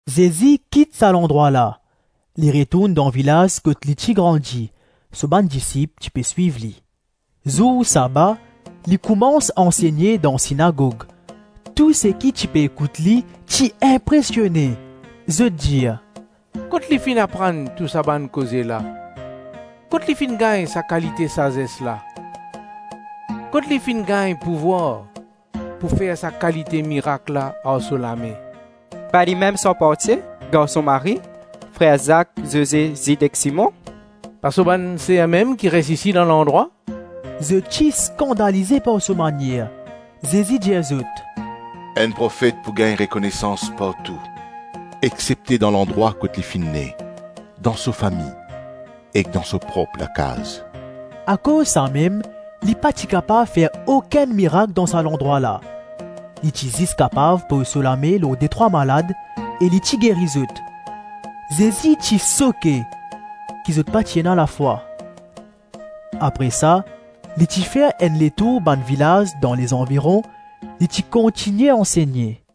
Zezi kit sa landrwa la, li retourn dan vilaz kot li ti grandi; so bann disip ti pe swiv li. Zour saba li koumans ansegne dan sinagog. Tou seki ti pe ekout li, ti inpresione. Zot dir, “Kot li finn aprann tou sa bann koze la? Kot li finn gagn sa kalite sazes la? Kot li finn gagn pouvwar pou fer sa kalite mirak la ar so lame? Pa limem sarpantie, garson Marie, frer Zak, Zoze, Zid ek Simon? Pa so bann ser mem ki res isi dan landrwa?” Zot ti skandalize par so manier. Zezi dir zot, “Enn profet pou gagn rekonesans partou exsepte dan landrwa kot li finn ne, dan so fami ek dan so prop lakaz.” Akoz samem, li pa ti kapav fer okenn mirak dan sa landrwa la; li ti zis kapav poz so lame lor detrwa malad, e li ti geri zot. Zezi ti soke ki zot pa ti ena lafwa. Apre sa, li ti fer enn letour bann vilaz dan lezanviron, li ti kontigne ansegne.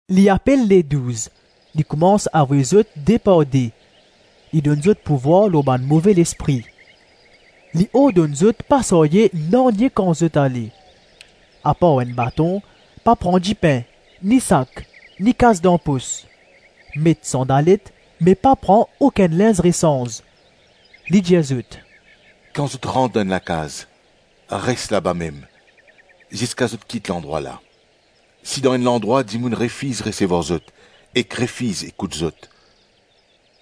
Li apel Ledouz; li koumans avoy zot de par de. Li donn zot pouvwar lor bann move lespri. Li ordonn zot pa sarye nanye kan zot ale, apar enn baton, pa pran dipin, ni sak, ni kas dan pos. Met sandalet, me pa pran okenn linz resanz. Li dir zot, “Kan zot rant dan enn lakaz, res labamem ziska zot kit landrwa la. Si dan enn landrwa dimoun refiz resevwar zot ek refiz ekout zot,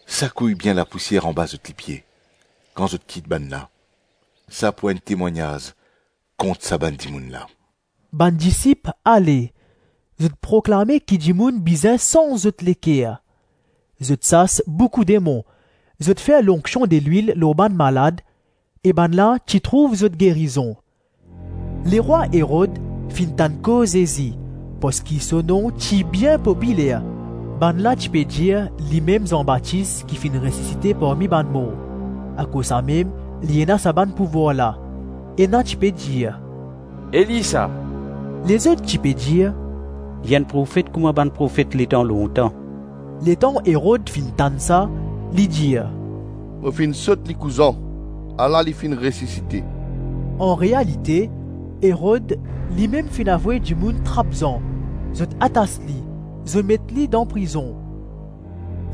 sakouy bien lapousier anba zot lipie, kan zot kit bannla, sa pou enn temwagnaz kont sa bann dimoun la.” Bann disip ale, zot proklame ki dimoun bizin sanz zot leker. Zot sas boukou demon, zot fer lonksion delwil lor bann malad e bannla ti trouv zot gerizon. Lerwa Erod finn tann koz Zezi, parski so nom ti bien popiler, bannla ti pe dir, limem Zan Batis ki finn resisite parmi bann mor, akoz samem li ena sa bann pouvwar la. Ena ti pe dir “Eli, sa.” Lezot ti pe dir, “Li enn profet kouma bann profet letan lontan.” Letan Erod finn tann sa, li dir, “Mo finn sot likou Zan, ala li finn resisite.” Anrealite, Erod limem finn avoy dimoun trap Zan; zot atas li, zot met li dan prizon.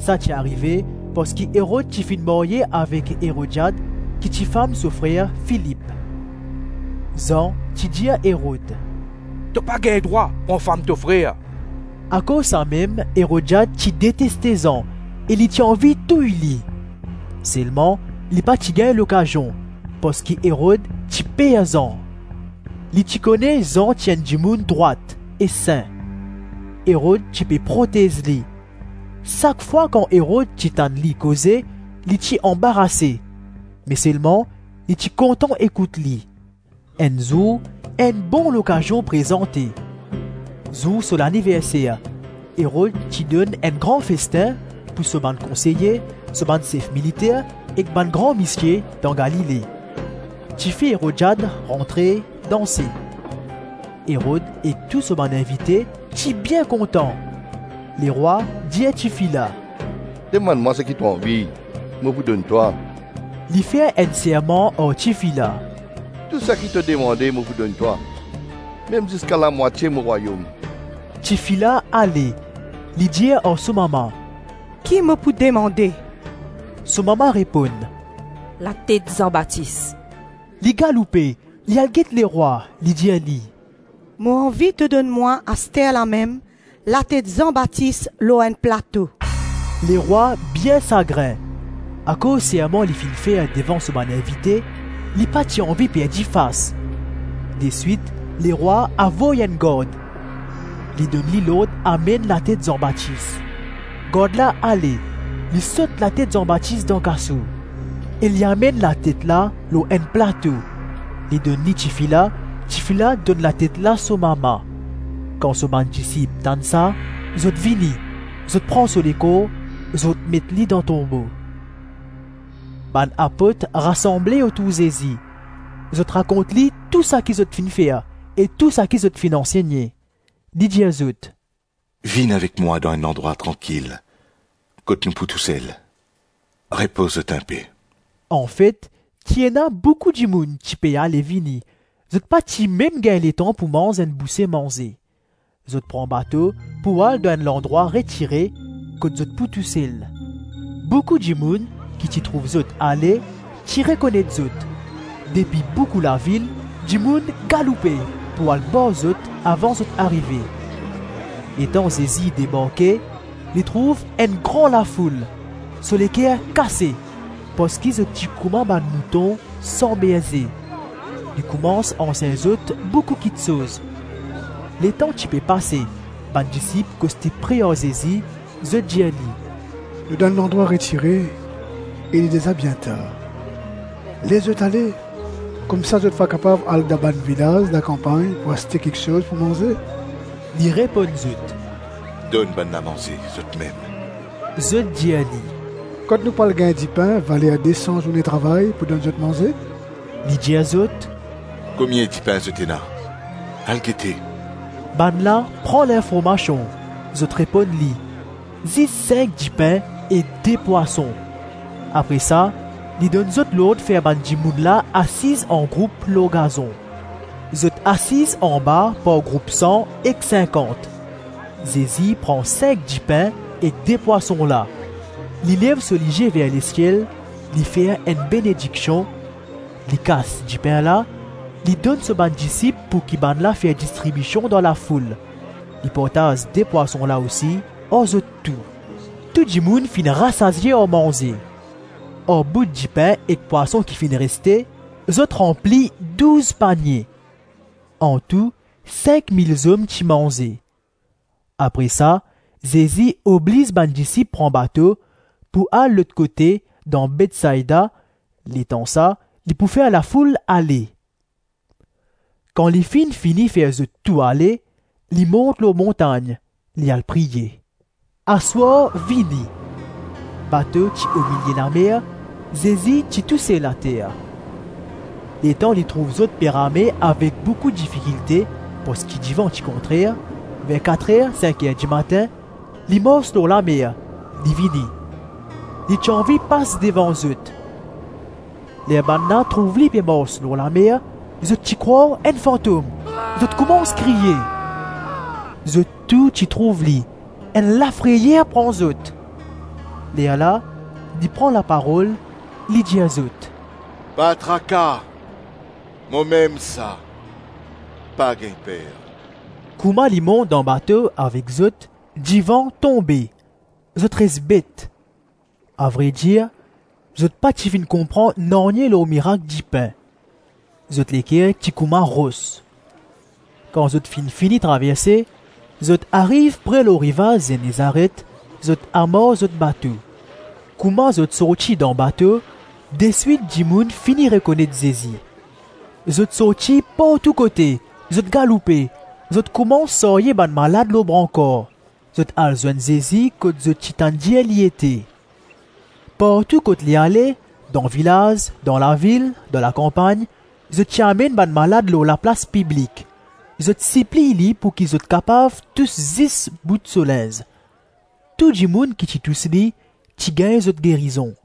Sa ti arive parski Erod ti finn marye avek Erodiad ki ti fam so frer Filip. Zan ti dir Erod, “To pa gagn drwa pran fam to frer.” Akoz samem Erodiad ti deteste Zan e li ti anvi touy li. Selman li pa ti gagn lokazion, parski Erod ti per Zan. Li ti kone Zan ti enn dimoun drwat e sin. Erod ti pe protez li; sak fwa kan Erod ti tann li koze, li ti anbarase me selman li ti kontan ekout li. Enn zour, enn bon lokazion prezante. Zour so laniverser, Erod ti donn enn gran festin pou so bann konseye, so bann sef militer ek bann gran misie dan Galile. Tifi Erodiad rantre, danse. Erod ek tou so bann invite ti bien kontan. Lerwa dir tifi la, “Demann mwa saki to anvi, mo pou donn twa.” Li fer enn serman ar tifi la, “Tou saki to demande, mo pou donn twa, mem ziska lamwatie mo rwayom.” Tifi la ale, li dir ar so mama, “Ki mo pou demande?” So mama reponn, “Latet Zan Batis.” Li galoupe, li al get lerwa, li dir li, “Mo anvi to donn mwa asterlamem, latet Zan Batis lor enn plato.” Lerwa bien sagrin. Akoz serman li finn fer devan so bann invite, li pa ti anvi perdi fas. Deswit, lerwa avoy enn gard. Li donn li lord amenn latet Zan Batis. Gard la ale, li sot latet Zan Batis dan kaso, e li amenn latet la lor enn plato; li donn li tifi la; tifi la donn latet la so mama. Kan so bann disip tann sa, zot vini, zot pran so lekor, zot met li dan tonbo. Bann apot rasanble otour Zezi. Zot rakont li tou saki zot finn fer e tou saki zot finn ansegne. Li dir zot, “Vinn avek mwa dan enn landrwa trankil kot nou pou tousel; repoz zot inpe.” Anfet, ti ena boukou dimoun ti pe ale-vini; zot pa ti mem gagn letan pou manz enn bouse manze. Zot pran bato pou al dan enn landrwa retire kot zot pou tousel. Boukou dimoun ki ti trouv zot ale, ti rekonet zot; depi boukou lavil, dimoun galoupe pou al bar zot avan zot arive. Letan Zezi debarke, li trouv enn gran lafoul; so leker kase parski zot ti kouma bann mouton san berze. Li koumans ansegn zot boukou kiksoz. Letan ti pe pase, bann disip koste pre ar Zezi, zot dir li, “Nou dan enn landrwa retire e li deza bien tar. Les zot ale, koumsa zot va kapav al dan bann vilaz lakanpagn pou aste kiksoz pou manze.” Li reponn zot, “Donn bannla manze, zotmem.” Zot dir li, “Kot nou pou al gagn dipin valer de-san zourne travay pou donn zot manze?” Li dir zot, “Komie dipin zot ena? Al gete.” Bannla pran linformasion, zot reponn li, zis sink dipin ek de pwason. Apre sa li donn zot lord fer bann dimoun la asiz angroup lor gazon. Zot asiz anba par group san ek sinkant. Zezi pran sink dipin ek de pwason la; li lev so lizie ver lesiel, li fer enn benediksion, li kas dipin la, li donn so bann disip pouki bannla fer distribision dan lafoul; li partaz de pwason la osi ar zot tou. Tou dimoun finn rasazie ar manze. Ar bout dipin ek pwason ki finn reste, zot ranpli douz panie. Antou sink-mil zom ti manze. Apre sa, Zezi obliz bann disip pran bato pou al lot kote dan Betsaida; letan sa, li pou fer lafoul ale. Kan li finn fini fer zot tou ale, li mont lor montagn, li al priye. Aswar vini, bato ti omilie lamer, Zezi ti tou sel ater. Letan li trouv zot pe rame avek boukou difikilte parski divan ti kontrer, ver kat-rer sink-er dimatin, li mars lor lamer, li vini. Li ti anvi pas devan zot. Ler bannla trouv li pe mars lor lamer, zot ti krwar enn fantom; zot koumans kriye. Zot tou ti trouv li; enn lafreyer pran zot. Lerla li pran laparol, li dir zot, “Pa traka, momem sa, pa gagn per.” Kouma li mont dan bato avek zot, divan tonbe; zot res bet. Avredir, zot pa ti finn konpran nanye lor mirak dipin; zot leker ti kouma ros. Kan zot finn fini traverse, zot ariv pre lor rivaz Zenezaret, zot amar zot bato. Kouma zot sorti dan bato, deswit dimoun fini rekonet Zezi. Zot sorti partou kote, zot galoupe, zot koumans sarye bann malad lor brankar; zot al zwenn Zezi kot zot ti tann dir li ete. Partou kot li ale, dan vilaz, dan lavil, dan lakanpagn, zot ti amenn bann malad lor laplas piblik; zot sipliy li pouki zot kapav tous zis bout so linz; tou dimoun ki ti tous li, ti gagn zot gerizon.